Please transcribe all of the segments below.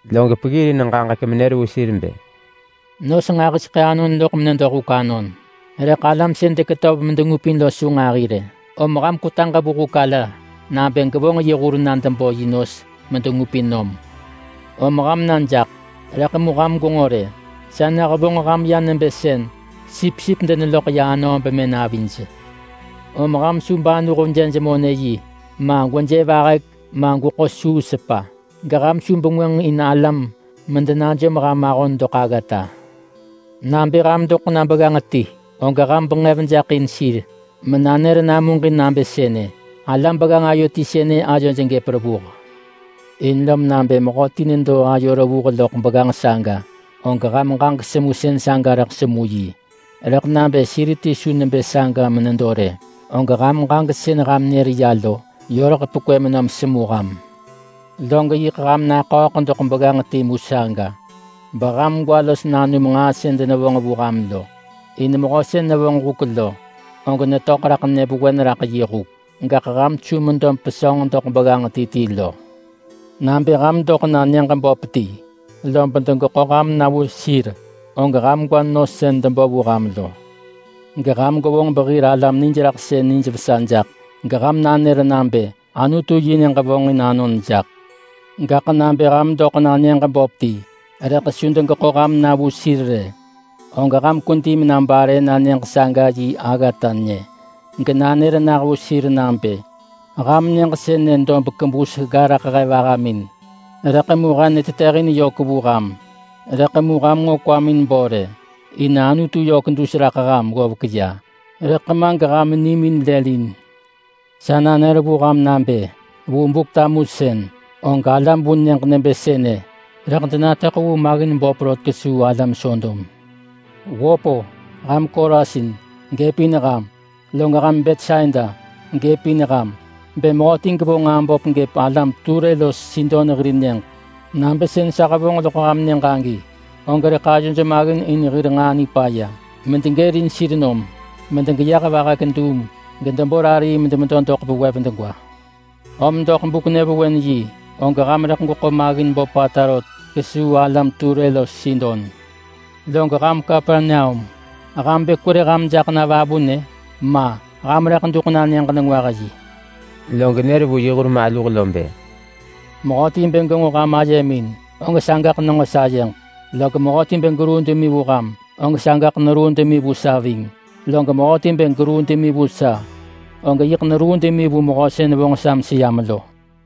Log peggirin ġaġek menër vu sir bë, “Nos nġahiseḳë anon loḳ menedo huk anon, rëḳ alam sën deketöv medengupin lo su nġahi rë. Om ham kwetaġ vu huk ala nabë gevonġ yi hur na debo yi nos medengupin nom. Om ham na jaḳ. Rëḳ mu ham gwenġo rë, sa nehevonġ ham ya nebë sën sipsip deneloḳ ya anöö bemën avij. Om ham su banuh jej monë-yi ma, gweje vahek ma, gweḳo suu sepa. Geham su bengwënġ in alam medenajom ham ahon doḳ aggata. Nabë ham doḳ na begganġ ti, og ham benġev jaḳ in sir menanër namuġin nabë sënë, ‘Alam begganġ ayo ti sënë ayoj gëp revuh.’ In lob nabë mehöti nedo ayo revuh loḳ begganġ saga, og ham ġaġek semusën saga rëḳ semu yi. Rëḳ nabë sir ti su nebë saga menedo rë, og ham ġaġek sën ham nër ya lo, yö rëḳ pekwë menom semu ham. Log yiḳ ham naḳööḳ doḳ begganġ timu saga, beham gwa los nanum nġaa sën denevonġ vu ham lo. In mehö sën nevonġ huk lo, og netöḳ raḳ nyëvewen raḳ yi huk. Gaḳ ham su medo mepesönġ doḳ begganġ ti ti lo. Nabë ham doḳ na nyëġ böp ti, lob degeḳo ham na vu sir, og ham gwa nos sën debo vu ham lo. Geham gwevonġ behir alam nijraḳsën nijvesa jaḳ. Geham nanër nabë, ‘Anutu yi nyëġ vonġin anon jaḳ.’ Gaḳ nabë ham doḳ na nyëġ böp ti, rëḳ su degeḳo ham na vu sir rë, og ham kwedi mena bare na nyëġ saga yi aggata nyë, genanër nah vu sir nabë, ‘Ham nyëġ sënë dob kebus gga raḳ he vahamin, rëḳ mu he netetëhin yök vu ham. Rëḳ mu ham nġo kwamin bo rë, in Anutu yök dus raḳ ham ggovek ya, rëḳ ma geham nimin lël in.’ Sa nanër vu ham nabë: Vu Buk-tamusën, og alam vu nyëġ nebë sënë rëḳ denatöḳ vu maggin böp rot kesuu alam Sodom.” “Wöp-o! Ham Korasin! Gëpin ham! Log ham Betsaida! Gëpin ham! Bë mehöti gevonġ nġaa böp gëp alam Ture los Sidon hir nyëġ nabë sën sa hevonġ loḳ ham nyëġ agi, og rëḳ ayoj maggin in devonġ nġaa nipaya medegërin sir nom medegeyeh vahek duum gedebo rarii medemedo doḳ vewev degwa. Om doḳ buk-nyëvewen-yi, og ham rëḳ gweḳo maggin böpata rot kesuu alam Ture los Sidon. Log ham Kapernaum, ham bë kwerë ham jaḳ na vavunë? Ma! Ham rëḳ duḳ na Nyëġ-nengwah-yi.” Log nër vu yi hur maluh lo bë, “Mehöti bë genġo ham ayemin, og sagaḳ nenġo sayeġ. Log mehöti bë geruu demi vu ham, og sagaḳ neruu demi vu sa ving. Log mehöti bë geruu demi vu sa, og yiḳ neruu demi vu Mehö sën vonġ sa meseyam lo.”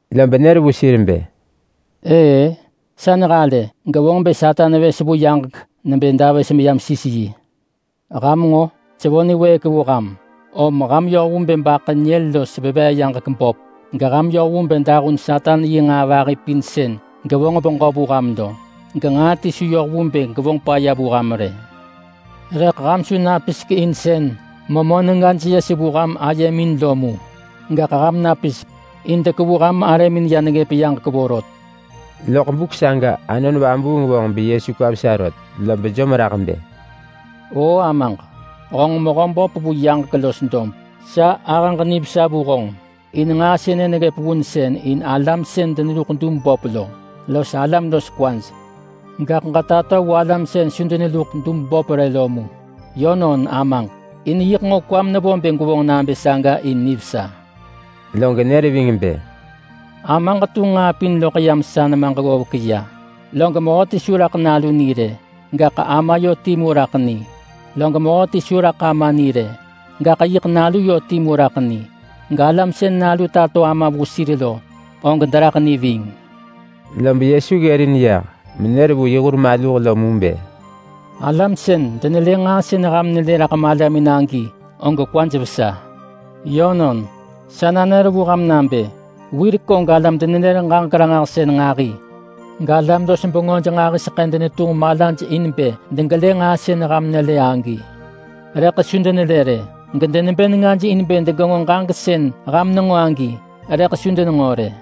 Lob nër vu sir bë, “Ëë-ë sa nehalë gevonġ bë Satan vës vu yaġek nebë davës meyam sis yi. Ham nġo! Sevo niwëëk vu ham, om ham yoh vu bë baḳë nyël los veveeyaġek böp, geham yoh vu bë dahun Satan yi nġaa vahi pin sën gevonġ beġö vu ham lo, genġaa ti su yoh vu bë gevonġ paya vu ham rë. Rëḳ mu ham su napisek in sën memö nengaj yes vu ham ayemin lo rë, gaḳ ham napisek in dekevu ham arëmin ya neggëp yaġek vorot.” Loḳ buk saga Anon Vabuung vonġ beYesu kwa vesa rot, lob jom raḳ bë, “Oo Amaġ, honġ Mehöböp vu yaġek los dob. Sa ahëġ nivesa vu honġ, in nġaa sënë neggëp vunsën in alam sën deneluḳ dub böp lo los alam los kwaj, gaḳ ġetato vu alam sën su deneluḳ dub böp rë lo mu. Yönon Amaġ, in yiḳ nġo kwam nevo bë gwevonġ nabë saga in nivesa.” Log nër ving bë, “Amaġ tunġ nġaa pin loḳ yam sa nemaġ ggovek ya. Log mehöti su raḳ Nalu ni rë, gaḳ Ama yö timu raḳ ni. Log mehöti su raḳ Ama ni rë, gaḳ yiḳ Nalu yö timu raḳ ni. Galam sën Nalu tato Ama vu sir lo, og deraḳ ni ving.” Lob Yesu ggërin yah menër vu yi hur maluh mu bë, “Alam sën denelë nġaa sën ham nelë raḳ malamin agi, og kwaj vesa. Yönon, sa nanër vu ham nabë: Wirek og alam-denenër-ġaġek-ranġahsën nġahi galam-los-bengöj nġahiseḳë denetunġ malaj in bë degelë nġaa sën ham nelë agi, rëḳ su denelë rë. Gedenebë nengaj in bë degenġo ġaġek sën ham nenġo agi, rëḳ su denenġo rë.”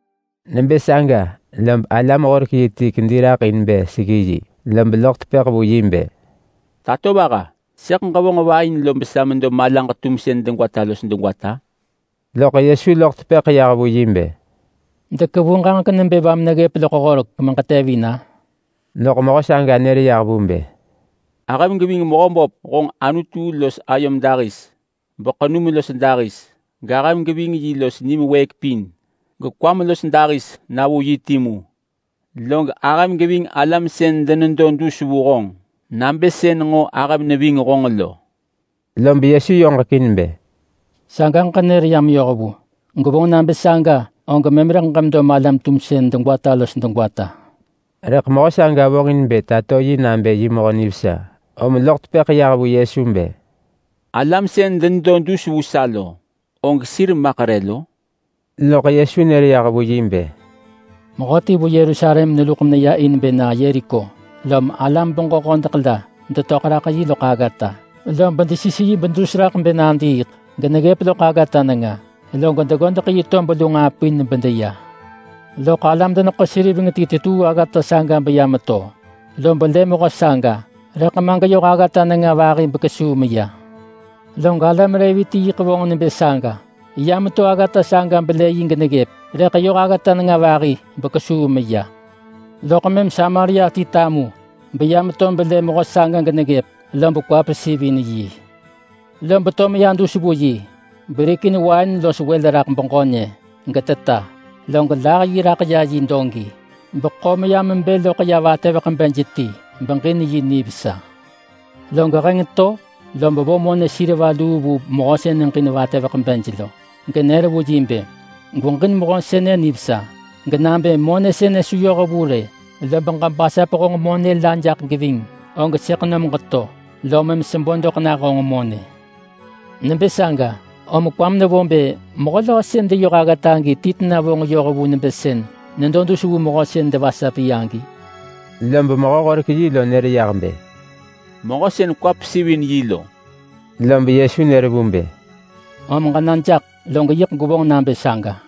Nebë saga lob alam-horek-yi ti kedi raḳ in bë seggi yi. Lob loḳ tepëḳ vu yi bë, “Tatovaha, sëḳ ġevonġ va in lob sa medo malaġ-tumsën degwata los degwata?” Loḳ Yesu loḳ tepëḳ yah vu yi bë, “Dekevu ġaġek nebë va meneggëp loḳ horek meġetevin-a?” Loḳ mehö saga nër yah vu bë, “Ahëm geving Mehöböp honġ Anutu los ayom dahis beḳenum los dahis, gahëm geving yi los nim wëëk pin, gekwam los dahis na vu yi timu. Log ahëm geving alam sën denedo dus vu honġ nabë sën nġo ahëm neving honġ lo.” Lob Yesu yoġekin bë, “Sagaḳ ġenër ya meyoh vu. Gwevonġ nabë saga, og mëm rëḳ ġemedo malam-tumsën degwata los degwata.” Rëḳ mehö saga vonġin bë tato yi nabë yi mehö nivesa, lom sën loḳ tepëḳ yah vu Yesu bë, “Alam sën denedo dus vu sa lo, og sir maḳ re lo?” Loḳ Yesu nër yah vu yi bë, “Mehöti vu Yerusalem meneluḳ meneya in bë na Yeriko. Lob alam-beġö-hodeḳ la detöḳ raḳ yi loḳ aggata, lob desis yi bedus raḳ bë nadiiḳ geneggëp loḳ aggata nenga. Log deggodeḳ yi tob lu nġaa pin bedeya. Loḳ alam-deneḳo-seriveng ti tetuu aggata saga beya meto, lob lë mehö saga, rëḳ ma geyö yoh aggata nenga vahi bekesuu meya. Log alam Levi ti yiḳ vonġ nebë saga. Ya meto aggata saga belë yi geneggëp, rëḳ yoh aggata nenga vahi, bekesuu meya. Loḳ mëm Samaria ti medo netamu beya meto belë mehö saga geneggëp, lob kwa pesivin yi. Lom to meya dus vu yi berikin wain los wël raḳ beġö nyë, geteta. Log tunġ yi raḳ ya yi dogi, beḳo meya mebë loḳ ya vatëveḳ-bej ti beġin yi nivesa. Log heng to, lob vo kina luu vu mehö sën neġin vatëveḳ-bej lo, genër vu yi bë, ‘Gweġin mehö sënë nivesa. Genabë monë sënë su yoh vu rë lob ġebasap honġ monë la jaḳ geving, og sëḳ nom geto, lob mëm sebo doḳ nah honġ monë.’ Nebë saga, om kwam nevo bë mehö löö sën deyoh aggata agi ti tena vonġ yoh vu nebë sën nedo dus vu mehö sën devasap yi agi?” Lob mehö-horek-yi lo nër yah bë, “Mehö sën kwa pesivin yi lo.” Lob Yesu nër vu bë, “Om ġena jaḳ, log yiḳ gwevonġ nabë saga.”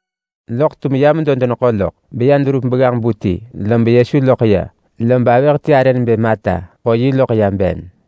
Loḳ tum ya medo deneḳo loḳ beya deverup begganġ-bu ti, lob Yesu loḳ ya, lob avëh ti arë nebë Marta ḳo yi loḳ ya ben.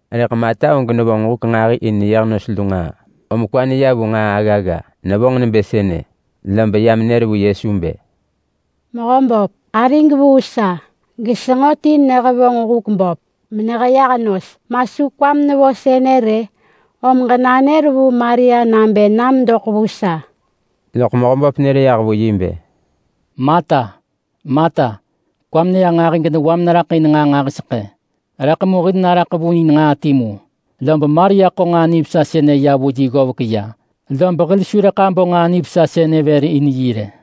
Rëḳ Marta og nevonġ huk nġahi in neyeh nos lu nġaa, om kwa neya vu nġaa aggagga. Nevonġ nebë sënë, lob ya menër vu Yesu bë, “Mehöböp, arig vuu sa gesenġo ti nehevonġ huk böp meneheyeh nos. Ma su kwam nevo sënë rë? Om ġenanër vu Maria nabë nam doḳ vu sa.” Loḳ Mehöböp nër yah vu yi bë, “Marta, Marta, kwam neya nġahi genewam neraḳ in nġaa nġahiseḳë. Rëḳ mu hil naraḳ vu in nġaa timu, lob Maria ḳo nġaa nivesa sënë ya vu yi ggovek ya, lob hil su rëḳ abo nġaa nivesa sënë vër in yi rë.”